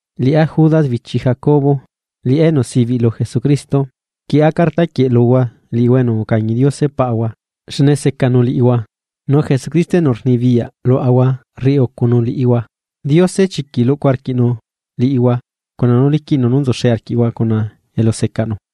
Liꞌá Judas, bichi Jacobo, liꞌá enu sibiꞌ lu Jesucristo, rquieꞌa carta quieꞌ luhua liꞌihua enu ucañi Diose Paꞌahua, xne secanu liꞌihua, nu Jesucristo enu rnibiyaꞌ luaꞌahua rriꞌi ucunu liꞌihua. Diose chiquiꞌ rluꞌcu arquiꞌ liꞌihua cuna nú liquiꞌnu nú nzuxe arquiꞌhua cuna elusecaꞌnu.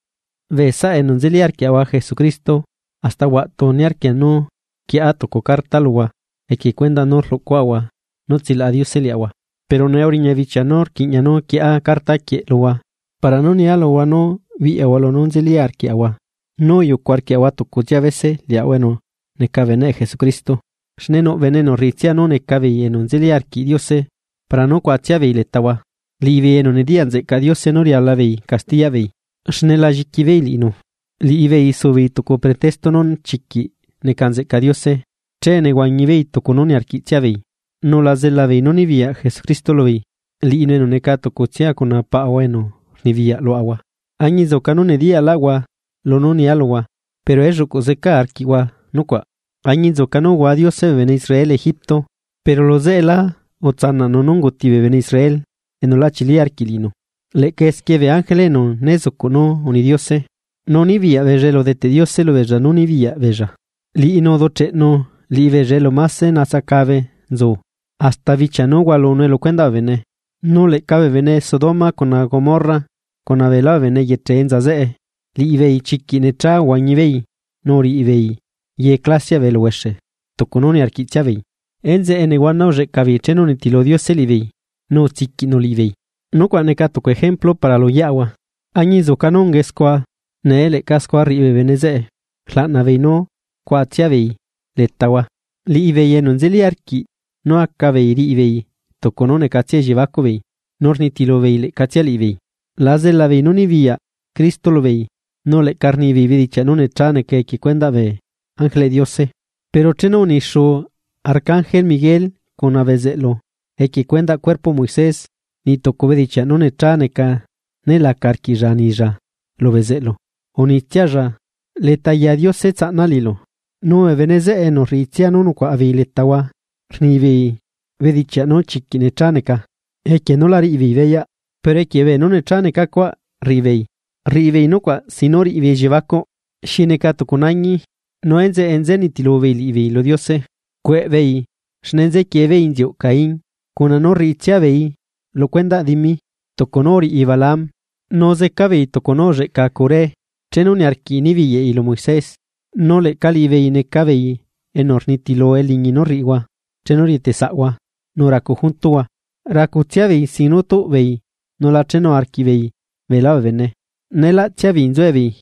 Bee saꞌa enu nzeli arquiaꞌahua Jesucristo, hasta huaꞌtu niarquia nú quieꞌa tucu carta luhua equie cuendaꞌ nú rluꞌcuaꞌahua nú tsilaꞌa Diose liaꞌahua. Pero nee uriña bichia nú rquiꞌña nú rquieꞌa carta quieꞌ luhua para nú nia luhua nú biꞌyahua lunú nzeli arquiꞌhua nú uyucu arquiꞌhua tucutsia bese liꞌihua enu neca beneꞌ Jesucristo. Xne nuꞌ bene enu rriꞌitsia nú neca beei enu nzeli arquiꞌ Diose para nú cuaꞌatsia beei letahua, liꞌibeei enu nediyaꞌ nzeꞌcaꞌ Diose nú rialabeei castiyaꞌbeei, xne la lliquibeei liꞌinu. Liꞌibeei subeei tucu pretexto nú chiquiꞌ neca nzeꞌca Diose, che nehuañibeei tucu nú niarquiꞌtsia beei, nu la zelabeei nú nibiyaꞌ Jesucristo lubeei, liꞌinu enu neca tucutsia cuna Paꞌahua enu rnibiyaꞌ luaꞌahua. Añinzuca nú nediyaꞌlaꞌhua lunú nia luhua, pero elluꞌcuꞌ zecaa arquiꞌhua nucuaꞌ, añinzuca nú uhua Diose bee bene Israel Egipto, pero luzeꞌelá utsanaꞌnu nú unguti bee bene Israel enu lá chilí arquiꞌ liꞌinu. Leꞌca esquie bee ángele enu né zucuꞌ nú uni Diose nú nibiyaꞌ beei elu udeteꞌ Diose nú nibiyaꞌ beei, liꞌinu uducheꞌnu liꞌibeei elu máse natsacabe nzu, hasta bichia nu hualunue lu cuendaꞌ bee bene. Nu leꞌca bee bene Sodoma cuna Gomorra cuna beelá bee bene eyeche enza zeꞌe, liꞌibeei chiquiꞌ necha uhuañibeei nu uriꞌibeei ye clasiaꞌ bee eluhuexe tucu nú niarquiꞌtsia beei. Enzeꞌe nehuana ulleꞌca beei chenu unitilu Diose liꞌibeei nu utsiquiꞌnu liꞌibeei, nucuaꞌ neca tucu ejemplu para lu yeaꞌahua. Añinzuca nú ungae scua, nee leꞌca scua rriꞌi bee bene zeꞌe rlaꞌnabeei nú cuaꞌatsiabeei letahua, liꞌibeei enu seca nú acabeei riꞌibeei tucu nú necatsia elliebacuꞌbeei, nu rnitilubeei leꞌcatsia liꞌibeei, la zela beei nú nibiyaꞌ Cristo lubeei nu leꞌca rnibeei bedichiaꞌ nú nechá neca equie cuendaꞌ bee ángeleꞌ Diose. Pero chenu unixuu arcangel Miguel cuna bezeꞌlu, equie cuendaꞌ cuerpoꞌ Moisés, niꞌ tucu bedichiaꞌ nú necha neca né laca arquiꞌlla anilla lu bezeꞌlu, unitsialla: “Leta ya Diose tsaꞌna liꞌilu.” Nu bee bene zeꞌe enu rriꞌitsia nú nucuaꞌa beei letahua rni beei bedichiaꞌ nú chiquiꞌ necha neca, equie nú la riꞌibeei beyaꞌ, pero equie beenú necha neca cuaꞌ rriꞌibeei, rriꞌibeei nucuaꞌ sin nú riꞌibeei elliebacuꞌ xi neca tucu nañi, nu enzeꞌe nzenitilu beei liꞌibeei lu Diose. ¡Cueꞌbeei!, xne nzequie beei inziuꞌ Caín. Cuna nú niarquiꞌtsia beei riꞌi beei ana dimi, tucu nú uriꞌi Balaam, nu zeca beei tucu nú ulleꞌca Coré, chenu niarquiꞌi nibiyaꞌi lu Moisés. Nu leꞌca liꞌibeei neca beei enu rnitilu eliñi nú rriꞌihua chenu rieteꞌ saꞌhua nu racu juntuhua, racutsia beei sin nú tuꞌbeei nu la chenu arquiꞌbeei beelá bee bene, neelaꞌtsia beei nzuebeei,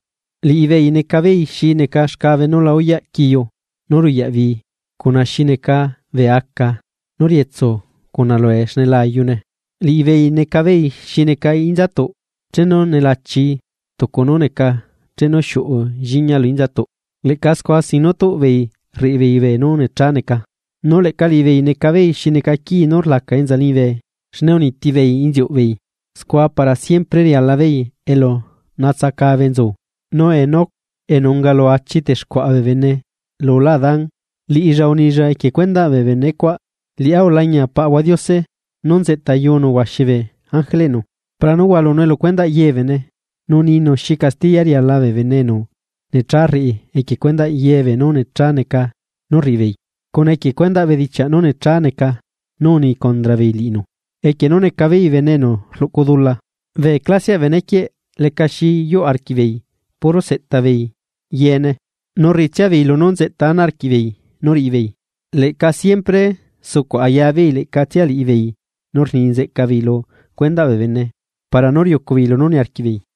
liꞌibeei neca beei xi neca xcabe nú la uyaꞌ quiu nú ruyaꞌ bii cuna xi neca bee aca nú rietsu cuna lue xne la ayune. Liꞌibeei neca beei xi neca inzatuꞌ chenu nelachii tucu nú neca chenu xiuꞌu lliña lu inzatuꞌ, leꞌca scua sin nu tuꞌbeei rriꞌibeei beenú nechá neca. Nu leꞌca liꞌibeei neca beei xi neca quii nú rlaca enza liñibe xne uniti beei inziuꞌ beei; scua para siempre riala beei elu natsacabe nzu. Nu Enoc, enu unga lu achi texcuaꞌa bee bene lulá Adán, liꞌilla unilla equie cuendaꞌ bee bene cuaꞌ: “Liꞌá ulañia Paꞌahua Diose nú nzeꞌtayunu huaxi bee ángeleꞌnu. Para nú hualunue lu cuendaꞌ ye bee bene, nu ninu xi castiya riala bee bene enu necha rriꞌi equie cuendaꞌ ye beenú necha neca nú rriꞌi beei, cuna equie cuendaꞌ bedichiaꞌ nú nechá neca nú uni condra beei liꞌinu, equie nú neca beei bene enu rluꞌcu dula.” Bee clasiaꞌ bee benequieꞌ leca xi yuꞌ arquiꞌbeei ye nú seꞌta beei, nu rriꞌitsia beei lunú nzeꞌta ana arquiꞌbeei nú riꞌibeei. Leꞌca siempre sucuꞌ aya beei leꞌcatsia liꞌibeei nu rni nzeꞌca beei lu cuendaꞌ bee bene para nú riucubeei lunú niarquiꞌbeei.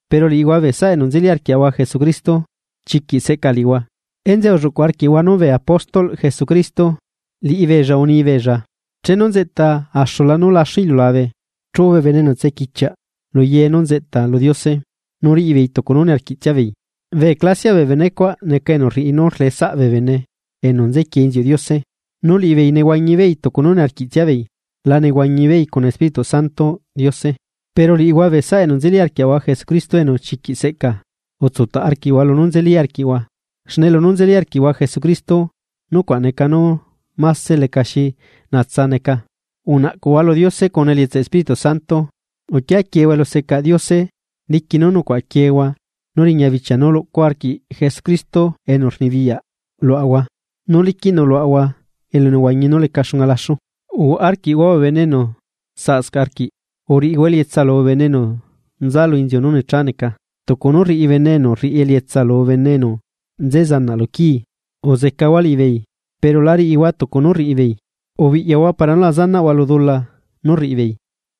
Pero liꞌihua bee saꞌa enu nzeli arquiaꞌahua Jesucristo, chiquiꞌ seꞌca liꞌihua. Enzeꞌe ulluꞌcuꞌ arquiꞌhua nu bee apóstolꞌ Jesucristo, liꞌibeella unibeella: “Chenu nzeꞌta axula nú láxu iliulabe chuꞌu bee bene enu tsequichiaꞌ lu ye nú nzeꞌta lu Diose, nu riꞌibeei tucu nú niarquiꞌtsiabeei.” Bee clasiaꞌ bee benecuaꞌ neca enu rriꞌi nu rleꞌe saꞌ bee bene enu nzequie inziuꞌ Diose, nu liꞌibeei nehuañi beei tucu nú niarquiꞌtsiabeei, la nehuañibeei cuna Espíritu Santoꞌ Diose. Pero liꞌihua bee saꞌa enu nzeli arquiaꞌahua Jesucristo enu chiquiꞌ seꞌca, utsutaꞌ arquiꞌhua lunú nzeli arquiꞌhua, xne lunú nzeli arquiꞌhua Jesucristo. Nucuaꞌ chiquiꞌ lecaxi ná, nu unaꞌcuꞌhua lu Diose cuna elietsaꞌ Espíritu Santo. Uquia quiehua elusecaꞌ Diose diqui nú nucuaꞌa quieehua nú riña bichia nú luꞌcu arquiꞌ Jesucristo liaꞌahua, nu liquiꞌnu luaꞌahua elunehuañi nú leca xunga laxu. Uhuaꞌa arquiꞌhua bee bene enu saꞌscaꞌ arquiꞌ. Uriꞌihua elietsa lubee bene enu nza lu inziu nú necha neca, tucu nú rriꞌi bene enu rriꞌi elietsa lu bene enu nze zanaꞌ lu quii, uzecahua liꞌibeei, pero la riꞌihua tucu nú rriꞌi beei, ubiꞌyahua para nú la zanaꞌhua lu dula nú rriꞌibeei.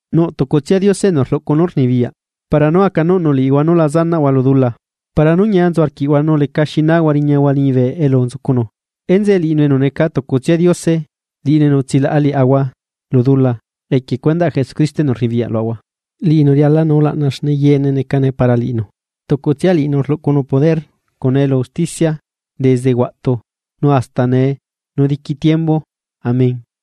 Nuꞌ tucutsia Diose enu rluꞌcu nú rnibiyaꞌ, para nú acanuꞌnu liꞌihua nú la zanaꞌhua lu dula, para nú ñia nzu arquiꞌhua nu leca xi nahua riñahua liñibe elu nzucunu. Enzeꞌe liꞌinu enu neca tucutsia Diose, liꞌinu enu utsilaꞌa liaꞌahua lu dula equie cuendaꞌ Jesucristo enu rnibiyaꞌ luaꞌahua, liꞌinu rialanu ulaꞌna xne yeene necane para liꞌinu, nu tucutsia liꞌinu rluꞌcunu poder cuna elu usticia desde huaꞌtu, nu hasta nee nu diqui tiembu. Amén.